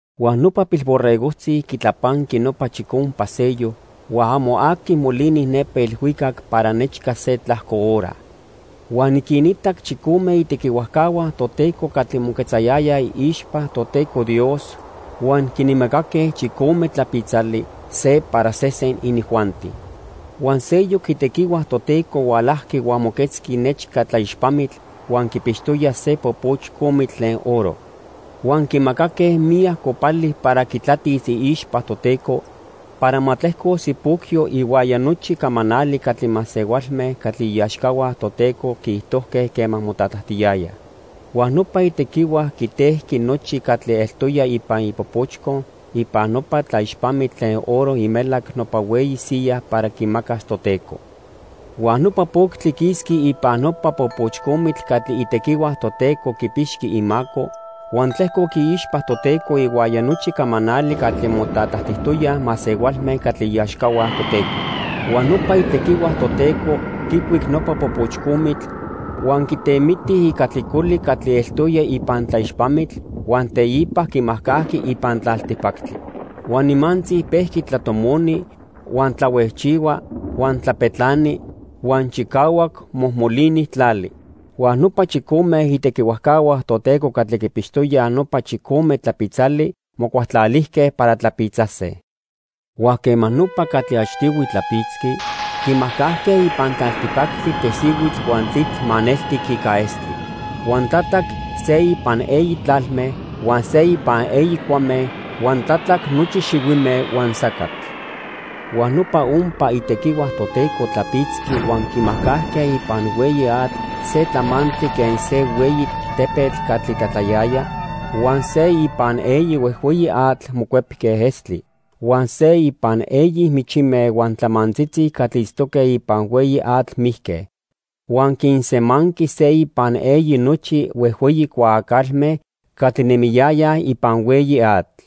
Huan nopa Pilborregojtzi quitlapanqui nopa chicompa sello, huan amo aqui molini nepa ilhuicac para nechca se tlajco hora. Huan niquinitac chicome itequihuajcahua Toteco catli moquetzayayaj iixpa Toteco Dios huan quinmacaque chicome tlapitzali, se para sesen inijuanti. Huan seyoc itequihua Toteco hualajqui huan moquetzqui nechca tlaixpamitl huan quipixtoya se popochcomitl tlen oro. Huan quimacaque miyac copali para quitlatis iixpa Toteco para ma tlejcos ipocyo ihuaya nochi camanali catli masehualme catli iaxcahua Toteco quiijtojque quema motlatlajtiyayaj. Huan nopa itequihua quitejqui nochi catli eltoya ipan ipopochco ipan nopa tlaixpamitl tlen oro imelac nopa hueyi siya para quimacas Toteco. Huan nopa poctli quisqui ipan nopa popochcomitl catli itequihua Toteco quipixqui imaco, huan tlejcoc iixpa Toteco ihuaya nochi camanali catli motlatlajtijtoyaj masehualme catli iaxcahua Toteco. Huan nopa itequihua Toteco quicuic nopa popochcomitl huan quitemiti ica tlicoli catli eltoya ipan tlaixpamitl, huan teipa quimajcajqui ipan tlaltipactli. Huan nimantzi pejqui tlatomoni, huan tlahuejchihua, huan tlapetlani, huan chicahuac mojmolini tlali. Huan nopa chicome itequihuajcahua Toteco catli quipixtoyaj nopa chicome tlapitzali mocualtlalijque para tlapitzase. Huan quema nopa catli achtihui tlapitzqui, quimajcajque ipan tlaltipactli tesihuitl huan tlitl maneltic ica estli. Huan tlatlac se ipan eyi tlalme, huan se ipan eyi cuame, huan tlatlac nochi xihuime huan sacatl. Huan nopa ompa itequihua Toteco tlapitzqui huan quimajcajque ipan hueyi atl se tlamantli quen se hueyi tepetl catli tlatlayaya, huan se ipan eyi huejhueyi atl mocuepque estli. Huan se ipan eyi michime huan tlamantzitzi catli itztoque ipan hueyi atl mijque, huan quinsemanqui se ipan eyi nochi huejhueyi cuaacalme catli nemiyayaj ipan hueyi atl.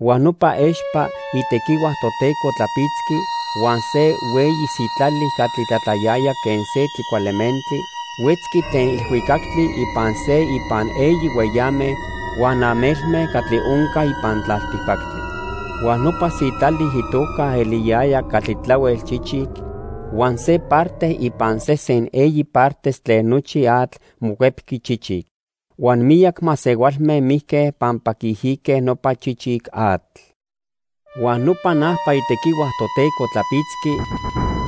Huan nopa expa itequihua Toteco tlapitzqui huan se hueyi sitlali catli tlatlayaya quen se tlicualementli huetzqui tlen ilhuicactli ipan se ipan eyi hueyame huan amelme catli onca ipan tlaltipactli. Huan nopa sitlali itoca eliyayaj Catli Tlahuel Chichic huan se parte ipan sesen eyi partes tlen nochi atl mocuepqui chichic, huan miyac masehualme mijque pampa quiijique nopa chichic atl. Huan nopa najpa itequihua Toteco tlapitzqui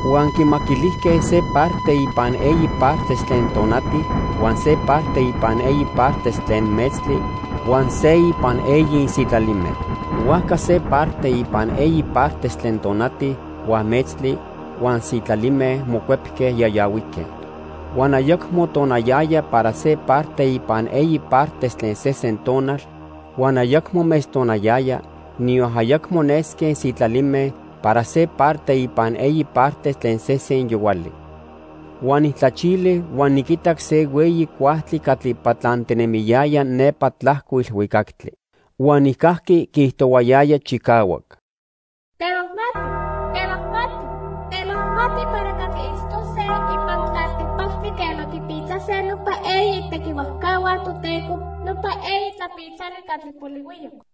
huan quimaquilijque se parte ipan eyi partes tlen tonati, huan se parte ipan eyi partes tlen metztli, huan se ipan eyi sitlalime. Huajca se parte ipan eyi partes tlen tonati, huan metztli, huan sitlalime mocuepque yayahuique. Huan ayacmo tonayaya para se parte ipan eyi partes tlen sesen tonal, huan ayacmo metztonayaya, niyon ayacmo nesque sitlalime para se parte ipan eyi partes tlen sesen yohuali. Huan nijtlachili huan niquitac se hueyi cuajtli catli patlantinemiyaya nepa tlajco ilhuicactli. Huan nijcajqui quiijtohuayaya chicahuac: "¡Temajmati, temajmati, temajmati para catli itztose ipan tlaltipactli quema quipitzase nopa eyi itequihuajcahua Toteco nopa eyi tlapitzali catli polihuiyoc!"